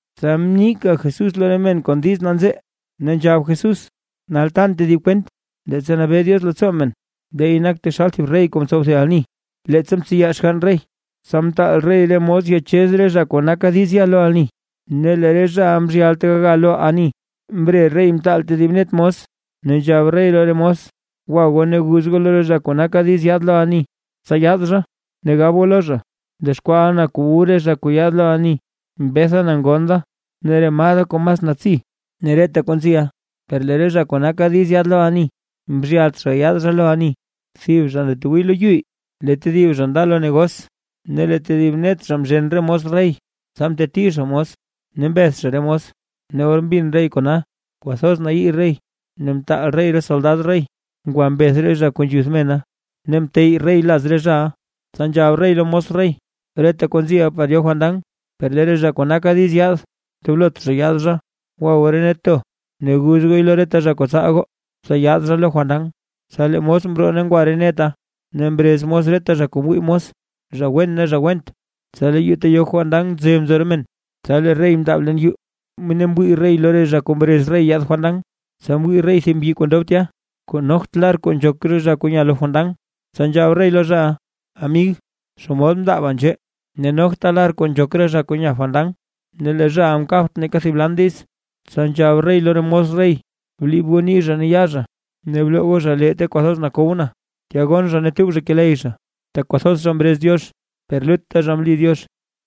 Tsa mnika Jesús lo re men kon diiz nanzee, ne nzhab Jesús: ―Nal tan tedib kwent. Leettsa nabee Diox leettsoo men, leey nak taxal thib rey kuu mtsow thib ani leettsa mtseya xgann rey. Tsa mtaal rey re mos ya yachez re zha kuu naka diiz ya lo ani, ne lee re zhaʼa mzhyalt gaya lo ani. Mbre rey mtaal tedib net mos, ne nzhab rey lo re mos: “Gwa goo ne guz lo re zha kuu naka diiz yaad lo ani, tsa yaad zha. Ne gab goo lo zha, mdexkwaaʼa na kuu wu re zha kuu yaad lo ani, mbetha na ngon da ne re maa da kuu mas natsi, ne reta kuu nziʼa.” Per lee re zha kuu naka diiz yaad lo ani mzhyalt gayaad lo ani. Thib zha ndatwii lo yu, lee tedib zha nda lo negos, ne lee tedib net zha mzhen re mos rey, tsa mteti zha mos, ne mbeth zha re mos. Ne or mbin rey kona, kwathoz mnayii rey ne mtaal rey re soldad rey ngwa mbeth re zha kuu nzhuth mena, ne mteyy rey laz re zhaʼa. Tsa nzhab rey lo re mos rey: “Reta kuu nziʼa par yo fandan, per lee re zha kuu naka diiz yaad, ndoblot zha yaad zha. Gwa goo re net to ne guz gooy lo reta zha kuu tsaal goo, tsa yaad zha lo fandan.” Tsa lee re mos mroo ngwa re neta, ne mrez mos reta zha kuu mwii mos, zha wen ne zha went; tsa lee yuu ta yo fandan mze nzo re men. ’Tsa lee rey mndaab leen yuu, ne mwii rey lo re zha kuu mrez rey yaad fandan, tsa mwii rey thib mbyi kuu ndob tya, kuu nogt lar kuu nzhok re zha kuu nya lo fandan. Tsa nzhab rey lo zhaʼa: “Amig, ¿xomod mndaaba nzhee ne nogta lar kuu nzhok re zha kuu nya fandan?” Ne lee zhaʼa mkabt neeka thib lan diiz. Tsa nzhab rey lo re mos rey: “Bliib goo nii zha ne yaa zha, ne bloo goo zha lee ta kwathoz nakow na, tya gonn zha ne tub zha keley zha”. Tak kwathoz zha mrez Diox per lut zha mli Diox.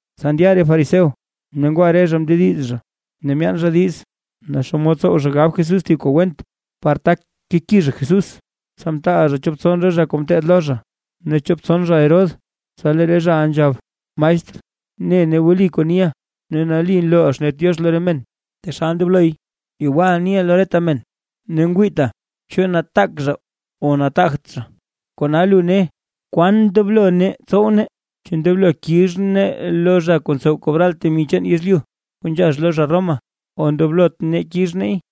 Tsa ndya re fariseo, ne ngwa re zha mndediz zha ne myaan zha diiz, naa xomod tsow zha gab Jesús thib kuu went, par tak keki zha Jesús. Tsa mtaal zha chop tson re zha zha kuu ngeteed lo zha, ne chop tson zha Herodes, tsa lee re zhaʼa nzhab: ―Maestr, ne nee wli kuu niʼa, ne nali nlooʼa xnet Diox lo re men taxal ndobloy, yewal niʼa lo reta men ne ngwiita chu nataak zha o nataagt zha. Kona lu ne, kwan ndoblo nee tsow nee: ¿Chu ndoblo kix nee lo zha kuu ntsow kobral temi chaan yezlyu, kuu nzhax lo zha Roma, o ndoblot nee kix neey?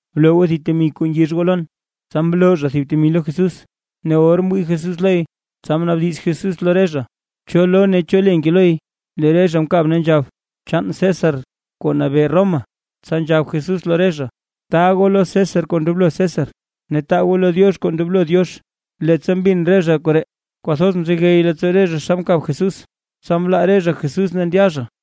Bloo goo thib temi kuu ngix goo lon. Tsa mloo zha thib temi lo Jesús. Ne or mwii Jesús loy, tsa mnaabdiz Jesús lo re zha: ―¿Cho lo ne cho le nke loy? Lee re zha mkab ne nzhab: ―Chaan César kuu nabee Roma. Tsa nzhab Jesús lo re zha: ―Taa goo lo César kuu ndoblo César, ne taa goo lo Diox kuu ndoblo Diox. Leettsa mbin re zha koree, kwathoz mzegey leettsoo re zha xa mkab Jesús, tsa mlaa re zha Jesús ne ndya zha.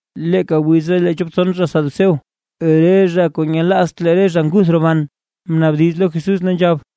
Leeka wiza lee chop tson zha saduceo, re zha kuu nyelaazt lee re zha nguth roban, mnaabdiz lo Jesús ne nzhab: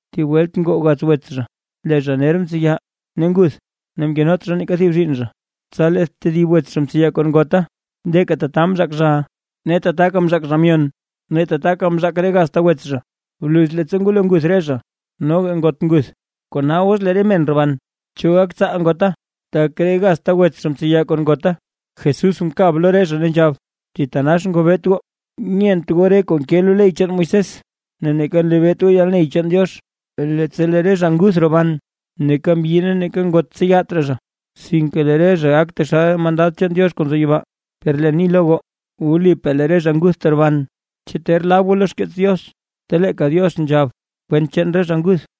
Thib welt ngoo gaz wets zha; lee zha ner mtseya ne nguth, ne mkenot zha neeka thib zhiinn zha, tsa lee tedib wets zha mtseya kon ngota. Leeka tata mzhaak zhaʼa, ne tataka mzhaak zha myon; ne tataka mzhaak reta gazta wets zha. Bluz leettsa ngwalo nguth re zha, noga ngot nguth. Kona os lee re men roban, ¿cho gak tsaal ngota, tak re gazta wets zha mtseya kon ngota? Jesús mkab lo re zha ne nzhab: ―¡Thitanax ngobeet goo! Nyent goo re kuu nke lo ley chaan Moisés, ne neeka nlebeet goo yalney chaan Diox. Leettsa lee re zha nguth roban, neeka mbyi ne neeka ngot tseyat raa, sinke lee re zha gak taxal re mandad chaan Diox kuu nzo yibaa. Per leen ni lo goo, wlipaa lee re zha nguth teroban. ¿Chu ter lab goo lo xkeets Diox, ta leeka Diox nzhab kwent chaan re zha nguth: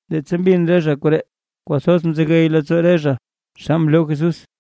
Leettsa mbin re zha koree kwathoz mzegey leettsoo re zha xa mloo Jesús.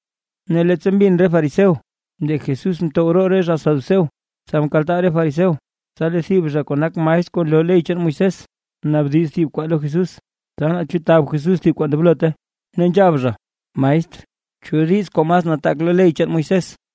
Ne leettsa mbin re fariseo lee Jesús mtow roo re zha saduceo, tsa mkaltaa re fariseo. Tsa lee thib zha kuu nak maestr kuu nloo ley chaan Moisés, mnaabdiz thib kwaa lo Jesús, tsa naa chu tab Jesús thib kuu ndoblot, ne nzhab zha: ―Maestr, ¿cho diiz kuu mas nataak lo ley chaan Moisés?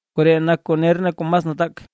Koree nak kuu ner ne kuu mas nataak.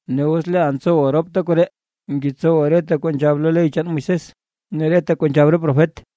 Ne os leeʼa ntsowa ropta koree, ngetsowa reta kuu nzhab lo ley chaan Moisés ne reta kuu nzhab re profet.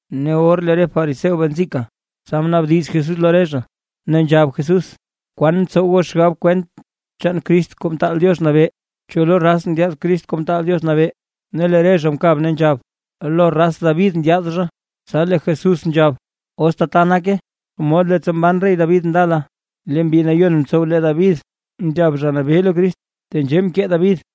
Ne or lee re fariseo bee nzika, tsa mnaabdiz Jesús lo re zha, ne nzhab Jesús: ―¿Kwaan ntsow goo xgab kwent chaan Crist Kuu Mtaal Diox Nabee? ¿Cho lo raz ndyaad Crist Kuu Mtaal Diox Nabee? Ne lee re zha mkab ne nzhab: ―Lo raz David ndyaad zha. Tsa lee Jesús nzhab: ―Os tata nake, xomod leettsa mban rey David ndala lee Mbi Nayon mtsow lee David, nzhab Zha Nabee lo Crist, tenzhee mkee David: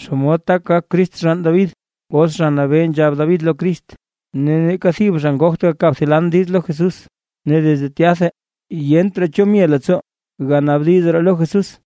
¿Xomod tak gak Crist xgann David, os Zha Nabee nzhab David lo Crist? Ne neeka thib zha ngogt gakab thib lan diiz lo Jesús. Ne desde tyatha, yent raa cho mye leettsoo ganaabdiz raa lo Jesús.